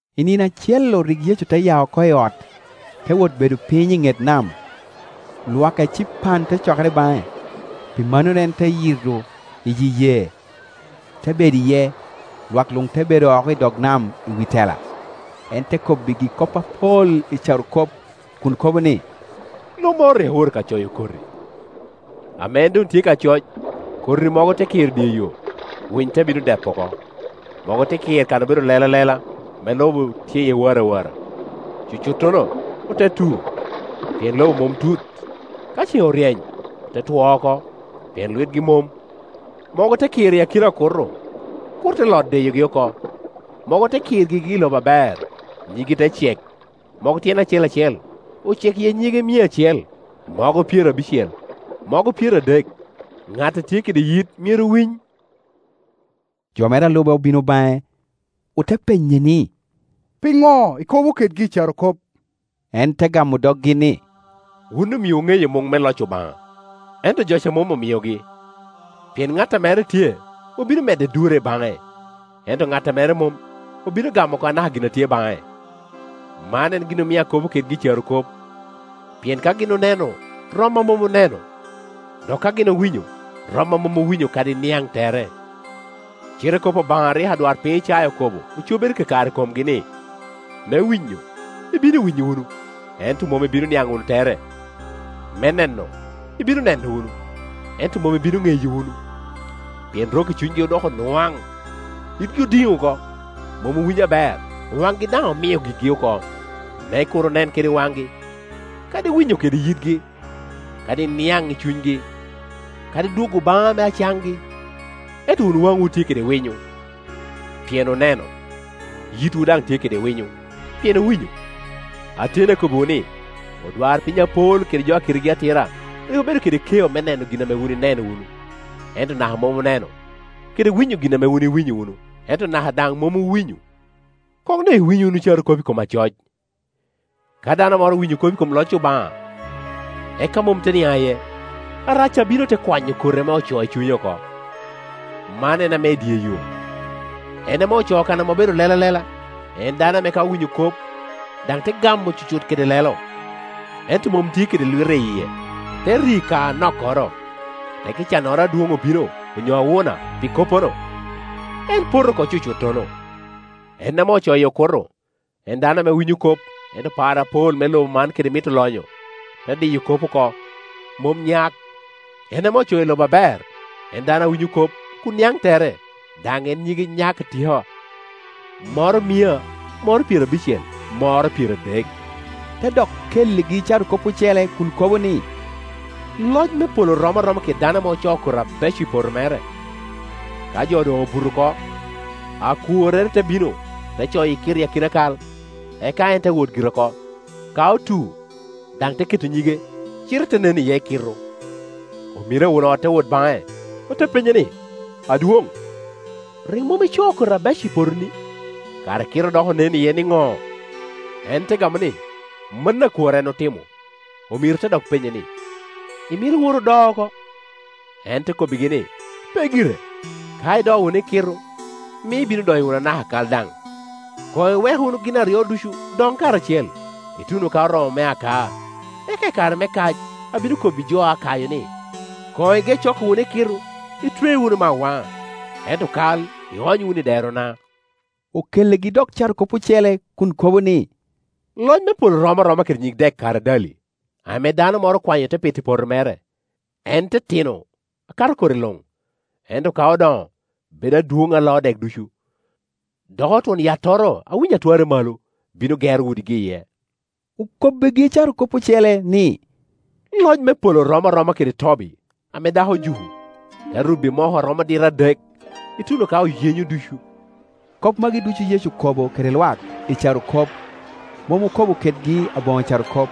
I nino acel-lu rik Yecu te ya oko i ot, te wot bedo piny i ŋet nam. Lwak ecipan te cokere baŋe; pi mannono en te yito iyi yee, te bedo iye, lwak luŋ te bedo oko i dog nam i wi tela. En te kobbigi kop apol i carokop kun kobo ni, “Lo moro rik owoto ka coyo koti. Ame en doŋ tye ka coc, koti mogo te kir i dye yo, winy te bino-depo oko. Mogo te kir kan obedo lela lela, ame lobo tye iye warawara. Cucuttono ote tu, pien lobo mom tut; ento ka cen oryeny ote two oko, pien lwitgi mom. Mogo te kir i akina oku to, okuto te lot diyogi oko. Mogo te kir gigi i lobo aber, nyiggi te cek; mogo tyene acel acel ocek iye nyige mia acel, mogo pyerabicel, mogo pyeradek. Ŋat a tye kede yit myero winy.” Jo mere a lu be obino baŋe, ote penye ni, “Piŋo ikobo kedgi i carokop?” En te gamo doggi ni, “Wun omiowu ŋeyo muŋ me loc Obaŋa, ento jo ca mom omiogi. Pien ŋat a mere tye obino medde te durre baŋe; ento ŋat a mere mom obino gamo oko anaka gin a tye baŋe. Man en gin omio akobo kedgi i carokop, pien ka gin oneno rom a mom oneno; dok ka gin owinyo rom a mom owinyo kadi niaŋ tere. Cite kop Obaŋa a rik adwarpiny Icaya okobo ocobere kakare i komgi ni, ‘Me winyo, ibino winyo wunu, ento mom ibino niaŋ wunu tere; me neno, ibino neno wunu, ento mom ibino ŋeyo wunu. Pien rok-ki cunygi odoko nwaŋ, yitgi odiŋ oko, mom owinyo aber, waŋgi daŋ omio gigi oko; me kur onen kede waŋgi, kadi winyo kede yitgi, kadi niaŋ i cunygi, kadi dwogo baŋa me acaŋgi.’ Ento wun waŋwu tye kede winyo, pien oneno, yitwu daŋ tye kede winyo, pien owinyo. Ateni, akobbiwu ni, odwarpiny apol kede jo a kitegi atira rik obedo kede keo me neno gin ame wun ineno wunu, ento naka mom oneno, kede winyo gin ame wun iwinyo wunu, ento naka daŋ mom owinyo. “Koŋ doŋ iwiny wunu carokop i kom acoc. Ka dano moro owinyo kop i kom loc Obaŋa eka mom te niaŋ iye, Arac ca bino te kwanyo koti ame ocoo i cunye oko; man en ame i dye yo. En ame ocoo kan obedo lela lela, en dano ame ka owinyo kop, daŋ te gamo cuto kede lelo, ento mom tye kede lwite i yie, te ri ka anokkoro; tekki cannoro adwoŋ obino, onyo awuna, pi koppono, en poto oko cucuttono. En ame ocoo i okuto, en dano ame winyo kop, ento par apol me lobo man kede mito lonyo te diyo kop oko, mom nyak. En ame ocoo i lobo aber, en dano a winyo kop kun niaŋ tere daŋ en nyige nyak atika, moro mia, moro pyerabicel, moro pyeradek.” Te dok kelligi carokop ocele kun kobo ni, “Loc me polo rom aroma kede dano ame ocoo koti abeco i poto mere. Kajo doŋ obuto oko, akworrere te bino, te coyo ekitu i akina kal, eka en te wot gire oko. Ka otu, daŋ te keto nyige, cite te nen iye ekitu. Omiro a won ot te wot baŋe, ote penye ni, ‘Adwoŋ, rik mom icoo koti abeco i potoni? Kara ekitu dok onen iye niŋo?’ En te gamo ni, ‘Mano akwor en otimo.’ Omiro te dok penye ni, ‘Imito owot odoo oko?’ En te kobbigi ni, ‘Pe gire; ka idoo wunu ekitu, mio ibino doyo wunu anaka kal daŋ. Koŋ iwek wunu gin aryo ducu doŋ karacel, ituno ka oromo me akaa. Eka i kare me kac abino kobbi jo a kayo ni. Koŋ ige coko wunu ekitu, itwe wunu me awaŋa, ento kal iony wunu i derona.’” Okelligi dok carokop ocele kun kobo ni, “Loc me polo rom aroma kede nyig dek karadali ame dano moro okwanyo te poto i poto mere. En titino akato koti luŋ, ento ka odoŋo bedo adwoŋ a loo dek ducu. Doko twon yattoro a winyi a twarre malo bino gero udigi iye.” Okobbigi carokop ocele ni, “Loc me polo rom aroma kede tobi ame dako ojuko, te rubo i moko a romo dita adek, ituno ka oyenyo ducu.” Kop magi ducu Yecu okobo kede lwak i carokop. Mom okobo kedgi aboŋo carokop,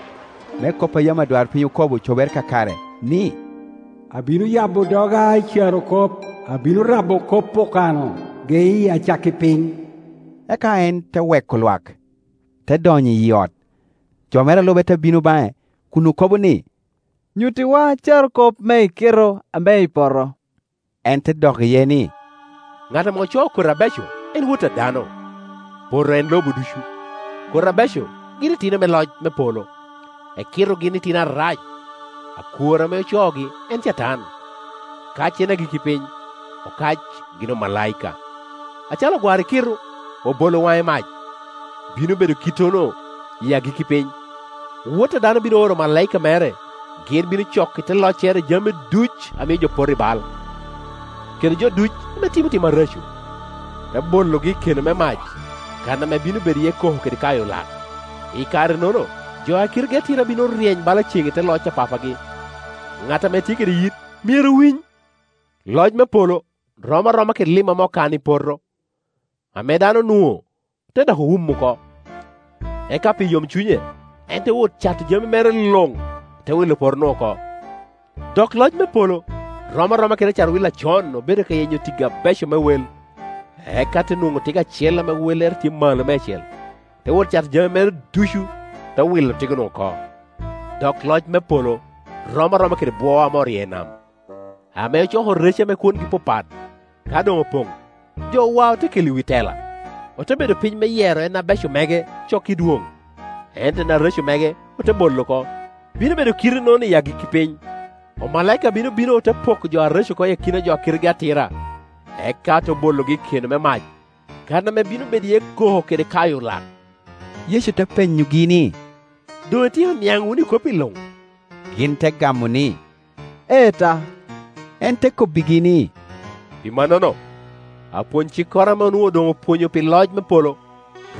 me kop a yam adwarpiny okobo cobere kakare, ni, “Abino yabo doga i carokop, abino rabo kop okano geye acakki piny.” Eka en te weko lwak, te donyo i ot, jo mere a lube te bino baŋe kun okobo ni, “Nyuttiwa carokop me ekitu ame i peto.” En te dok iye ni, “Ŋat ame ocoo koti abeco en Wot a dano; poto en lobo ducu, koti abeco gin itino me loc me polo, ekitu gin itino Arac. Akwor ame ocoogi en Catan; kac en agikki piny, okac gin omalaika. Acalo ogwaro ekitu, obolo owaŋo i mac, bino bedo kittono i agikki piny. Wot a dano bino oro omalaika mere, gin bino coko i te loccere jami ducu a mio jo poto i bal, kede jo ducu ame otim tim areco, te bologi i keno me mac, kan ame bino bedo iye koko kede kayo lak. I karenono jo ame kitegi atira bino ryeny bala cen i te loc a Papagi. Ŋat ame tye kede yit, myero winy. “Loc me polo rom aroma kede lim ame okano i poto, ame dano onwoŋo, te dok wumo oko; eka pi yomcunye, en te wot cato jami mere luŋ, te wilo poto-nu oko. “Dok loc me polo rom aroma kede acat-wil a con obedo ka yenyo tiggi abeco me wel, eka te nwoŋo tigo acel ame wellere tye malo meicel, te wot cato jami mere ducu, te wilo tigo-nu oko. “Dok loc me polo rom aroma kede bwo ame oryeo i dye nam, ame ocoko rece ame kwongi papat. Ka doŋ opoŋ, jo wao, te kelo i wi tela, ote bedo piny me yero en abeco mege coko i dwoŋ, ento en areco mege ote bolo oko. Bino bedo kite-nono i agikki piny. Omalaika bino bino, ote poko jo areco oko i akina jo a kitegi atira, eka te bologi i keno me mac, kan ame bino bedo iye koko kede kayo lak.” Yecu te penyogi ni, “Doŋ ityeko niaŋ wunu i kopi luŋ?” Gin te gamo ni, “Ee ta.” En te kobbigi ni, “Pi mannono, apwony-cikkoro ame nwoŋo doŋ opwonyo pi loc me polo,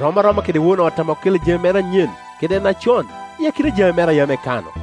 rom aroma kede won ot ame okelo jami anyen kede acon i akina jami mere a yam ekano.”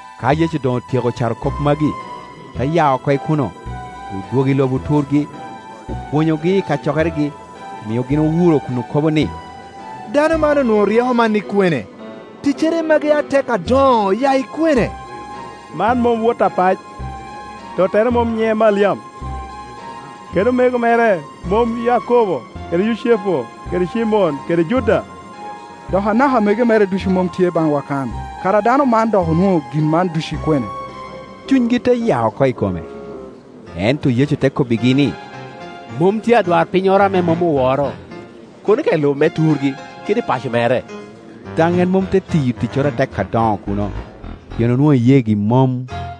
Ka Yecu doŋ otyeko carokop magi, te ya oko i kuno, odwogo i lobo turgi, opwonyogi I kacokeregi, omio gin owuro kun okobo ni, “Dano man onwoŋo ryeko man i kwene? Ticcere magi atek adoŋo oya i kwene? Man mom wot apac? Tottere mom nyiŋe Maliam? Kede omego mere mom Yakobo kede Yucepu kede Cimon kede Juda? Dok anaka amego mere ducu mom tye baŋwa kan? Kara dano man dok onwoŋo gin man ducu i kwene?” Cunygi te ya oko i kome. Ento Yecu te kobbigi ni, “Mom tye adwarpinnyoro ame mom oworo, kono ka i lobo me turgi, kede i paco mere.” Daŋ en mom te tiyo ticcoro atek adoŋo kuno, pien onwoŋo iyeegi mom.